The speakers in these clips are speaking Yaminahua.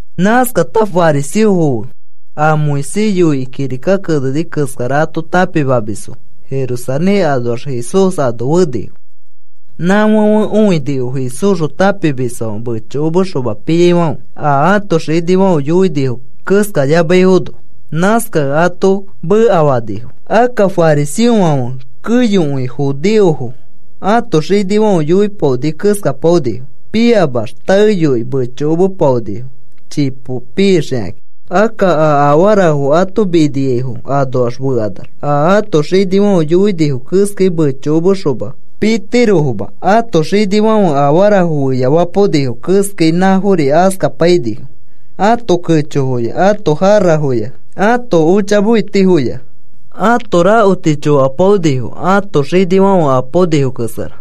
Nãskata fariseofo fe a Moisés yoikĩ kirika keneni keskara ato tãpimamisfo Jerusalén anoax Jesús ano fenifo. Nãfãfe õinifo Jesúsxõ tãpimisfãfe mechokomexoma piaifãfe, a ãto xinifãfe yoinifo keskayamaifono. Nãskakẽ ato mekafanifo. Akka fariseofãfe keyokõi judeofo ãto xinifãfe yoipaoni keskapaonifo. Piamax taeyoi mechomepaonifo chipo pixakakĩ. Akka a afarafo ato miniaifo anoax fekanax, a ato xinifãfe yoinifo keskai mechokomekaxoma pitirofoma. Ãto xinifãfe afarafo feyafapaonifo keskai nãfori askapainifo. Ãto kechofoya, ãto jarafoya ãto ochamefetifoya, ãto rakoti chokapaonifo ãto xinifãfe apaonifo keskara.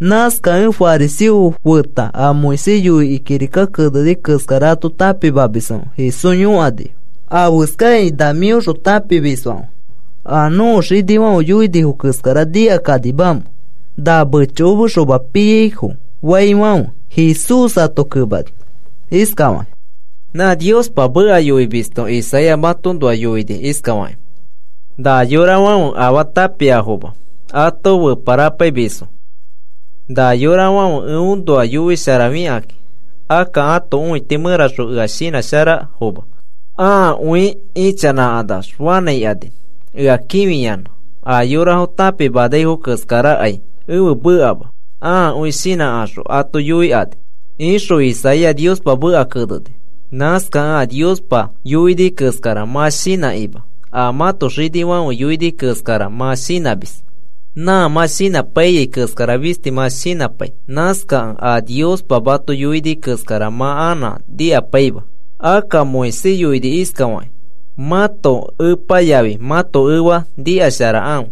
Nãskakẽ fariseofo feta a Moisés yoikĩ kirika keneni keskara ato tãpimamisfãfe Jesús yõkanifo: “¿Afeskakĩ na mĩõxõ tãpimisfãfe a nõko xinifãfe yoinifo keskara nikakanimamẽ na mechokomexoma piaifofaifãfe?” Jesús ato kemani iskafakĩ: “Nã Niospa meka yoimisto Isaías matoõnoa yoini iskafakĩ: Na yorafãfe afaa tãpiafoma ato feparapaimisfo. Na yorafãfe eõnoa yoisharafikakĩ, akka ãto õiti mẽraxõ ea shinãsharafoma. Ãakõi ichanãkanax fanãikani ea kĩfiyanã. A yorafo tãpimanaifo keskarakai ẽfe mekama. Ãakõi shinãkaxõ ato yoikani, ixõ Isaías Niospa meka keneni. Nãskakẽ a Niospa yoini keskara mã shinãkima, a mãto xinifãfe yoini keskara mã shinãmis. “Nã mã shinãpaiyai keskara fisti mã shinãpai. Nãskakẽ a Niospa mato yoini keskara mã anã nikapaima. Akka Moisés yoini iskafakĩ: ‘Mãto epa yafi mãto efa nikasharakãfe.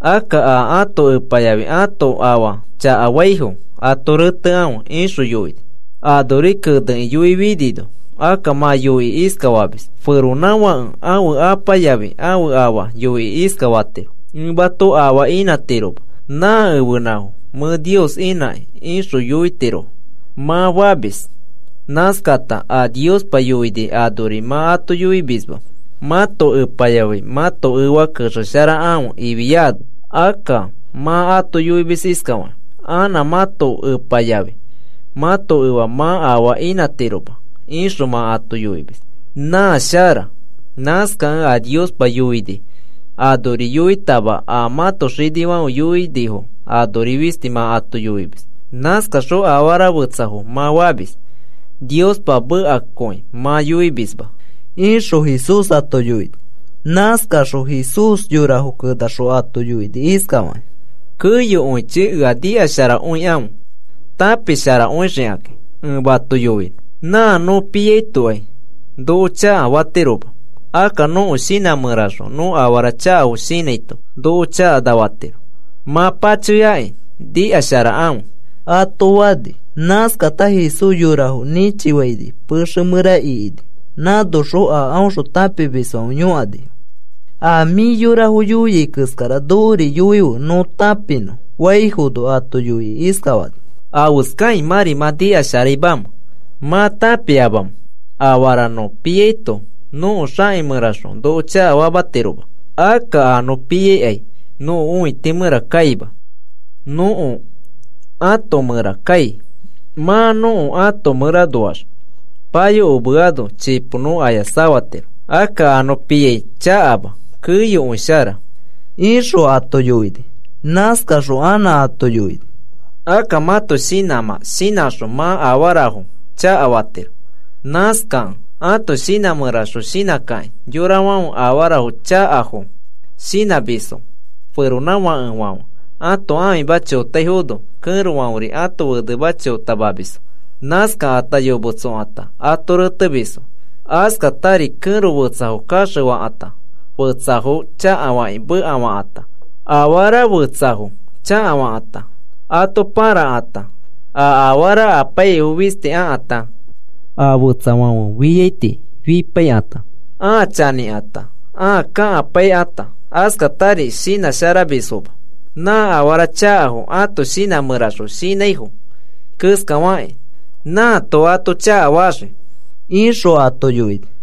Akka a ãto apa yafi ãto afa chakafaifo ato retekãfe,’ ixõ yoini. Anori kenekĩ yoifinino, akka mã yoikĩ iskafamis: ‘Feronãfãke ãfe apa yafi ãfe afa yoikĩ iskafatiro: “Ẽ mato afaa inãtiroma, nã ẽfenãfo mẽ Nios inãkĩ ixõ yoitirofo,” ’ mã famis. Nãskata a Niospa yoini anori mã ato yoimisma mãto epa yafi mãto efa kexeshakãfe ifiano. Akka mã ato yoimis iskafakĩ: ‘Anã mãto epa yafi mãto efa mã afaa inãtiroma,’ ixõ mã ato yoimis. Na shara. Nãskakẽ a Niospa yoini anori yoitama, a mãto xinifãfe yoipaonifo anori fisti mã ato yoimis. Nãskaxõ afara fetsafo mã famis, Niospa mekakõi mã yoimisma,” ixõ Jesús ato yoini. Nãskaxõ Jesús yorafo kenaxõ ato yoini iskafakĩ: “Keyokõichi ea nikasharakõikãfe tãpisharakõixikakĩ ẽ mato yoinõ. Nã nõ piaitokai noko chakana fatiroma, akka nõko shinã mẽraxõ nõ afara chakafo shinãito noko chakanafatiro. Mã pachoyakĩ nikasharakãfe,” ato fani. Nãskata Jesús yorafo nĩchifaini pexe mẽra ikini, nãnoxõ a aõxõ tãpimisfãfe yõkanifo: “A mĩ yorafo yoia keskara nokori yoife nõ tãpinõ,” faifono, ato yoikĩ iskafani: “¿Afeskakĩ mãri mã nikasharaimamẽ? ¿Mã tãpiamamẽ afara nõ piato nõko xaki mẽraxõ noko chakafatiroma? Akka a nõ piai nõko õiti mẽra kaima, nõko ãto mẽra kai, mã nõko ãto mẽranoax payokomeano chipo nõ aya safatiro.” “Akka a nõ piai chakama, keyokõi shara,” ixõ ato yoini. Nãskaxõ anã ato yoini: “Akka mãto shinãmã shinãxõ mã afarafo chakafatiro. Nãskakẽ ãto shinã mẽraxõ shinãkakĩ, yorafãfe afara chakafo shinãmisfo. Feronãfakefãfe ãto ãfima chotaifono, kẽrofãferi ãto fenema chotamamisfo. Nãskata yometsokata, ato retemisfo. Askatari kẽro fetsafo kaxefakãta, fetsafo chakafakĩ, mekafakãta; afara fetsafo chakafakãta, ato pãrakãta, a afara apaiyaifo fisti akãta, a fetsafãfe fiaiti fipaikãta, ãa chanĩkãta, ãa kakapaikãta, askatari shinãsharamisfoma. Nã afara chakafo ãto shinã mẽraxõ shinãifo keskafakĩ nãato ato chakafaxii,” ixõ ato yoini.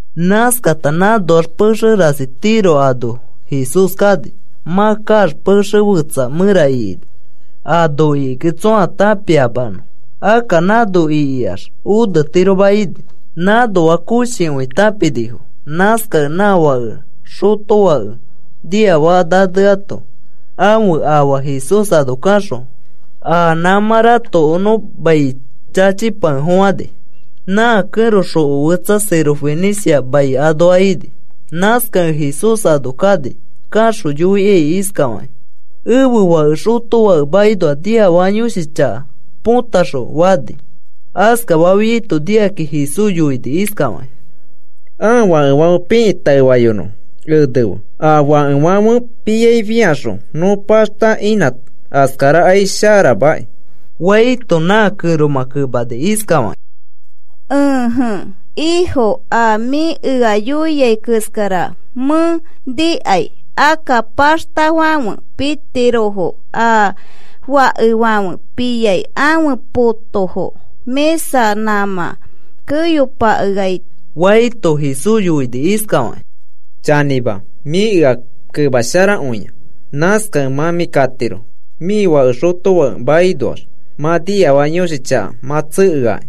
Nãskata nãnoax pexe rasi Tiro ano Jesús kani. Mã kaax pexe fetsa mẽra ikini, ano ikikẽ tsõa tãpiamanõ. Akka nãno ikiax onetiroma ini. Nãnoa koshikõi tãpinifo, nãskakẽ nã fake xotofake niafaka naneato ãfe afa Jesús ano kaxõ a nãmã ratokonõ mai chachipakefofãni. Nã kẽro xoko fetsa Sirofenicia mai anoa ini. Nãskakẽ Jesús ano kani. Kaxõ yoikai iskafakĩ: “Ẽfe fake xotofake makinoa niafaka yõshi chaka potaxõfe,” fani. Askafafiaito nikakĩ Jesús yoini iskafakĩ: “Ãa fakefãfe pikĩ taefayonõfo. Enefe, a fakefãfe piai fĩaxõ nõ paxta inã, askarakai sharamaki,” faito, nã kẽromã kemani iskafakĩ: “Ẽje Ifo, a mĩ ea yoiai keskara mẽ nikai. Akka paxtafãfe pitirofo a fakefãfe piai ãfe potofo mĩsa nãmã keyo pakeaito,” faito, Jesús yoini iskafakĩ: “Chanĩma, mĩ ea kemasharakõia. Nãskakẽ mã mĩ katiro, mĩ fake xotofake makinoax mã niafaka yõshi chaka mã tsekeaki,”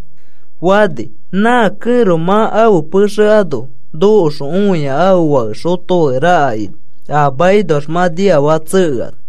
fani. Nã kẽro mã ãfe pexe ano nokoxõ õia ãfe fake xotofake raka ini, a makinoax mã niafaka tsekeano.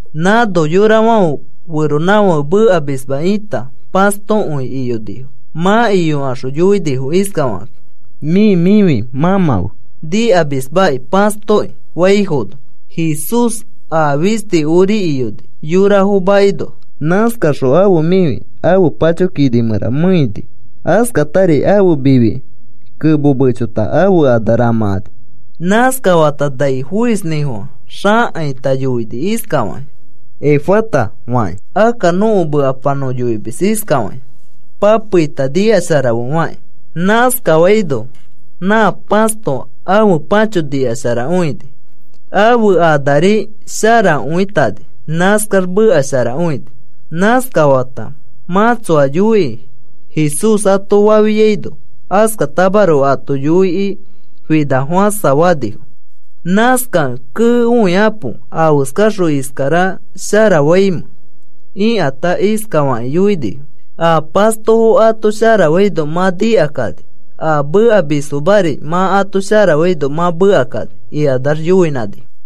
Nãno yorafãfe feronãfake mekamisma ita pãstokõi iyonifo. Mã iyokaxõ yoinifo iskafakakĩ: “Mĩ mĩfi mãmãfe nikamismaki pãstokĩ,” faifono, Jesús a fisti ori iyoni, yorafo makinoa. Nãskaxõ ãfe mĩfi ãfe pacho kini mẽra meeini. Askafatari ãfe mifiki kemo mechota ãfe ana ramãkani. Nãskafata nai foisnĩfofã xakaita yoini iskafakĩ: “Efata,” fakĩ. (Akka nõko mekapa nõ yoimis iskafakĩ: “Papeita nikasharafe,” faki.) Nãskafaino, nã pãsto ãfe pãcho nikasharakõini. Ãfe anari sharakõitani, nãskax meka sharakõini. Nãskafata, “Mã tsoa yoiki,” Jesús ato fafiaino, askatamaroko ato yoikĩ finakõifofãsa fanifo. Nãskakẽ, “¡Kee, õikapo! ¿Afeskaxõ iskara sharafaimẽ?” ikata iskafakĩ yoinifo: “A pastofo ato sharafaino mã nikakani, a mekamisfomari mã ato sharafaino mã mekakani,” ikanax yoinãnifo.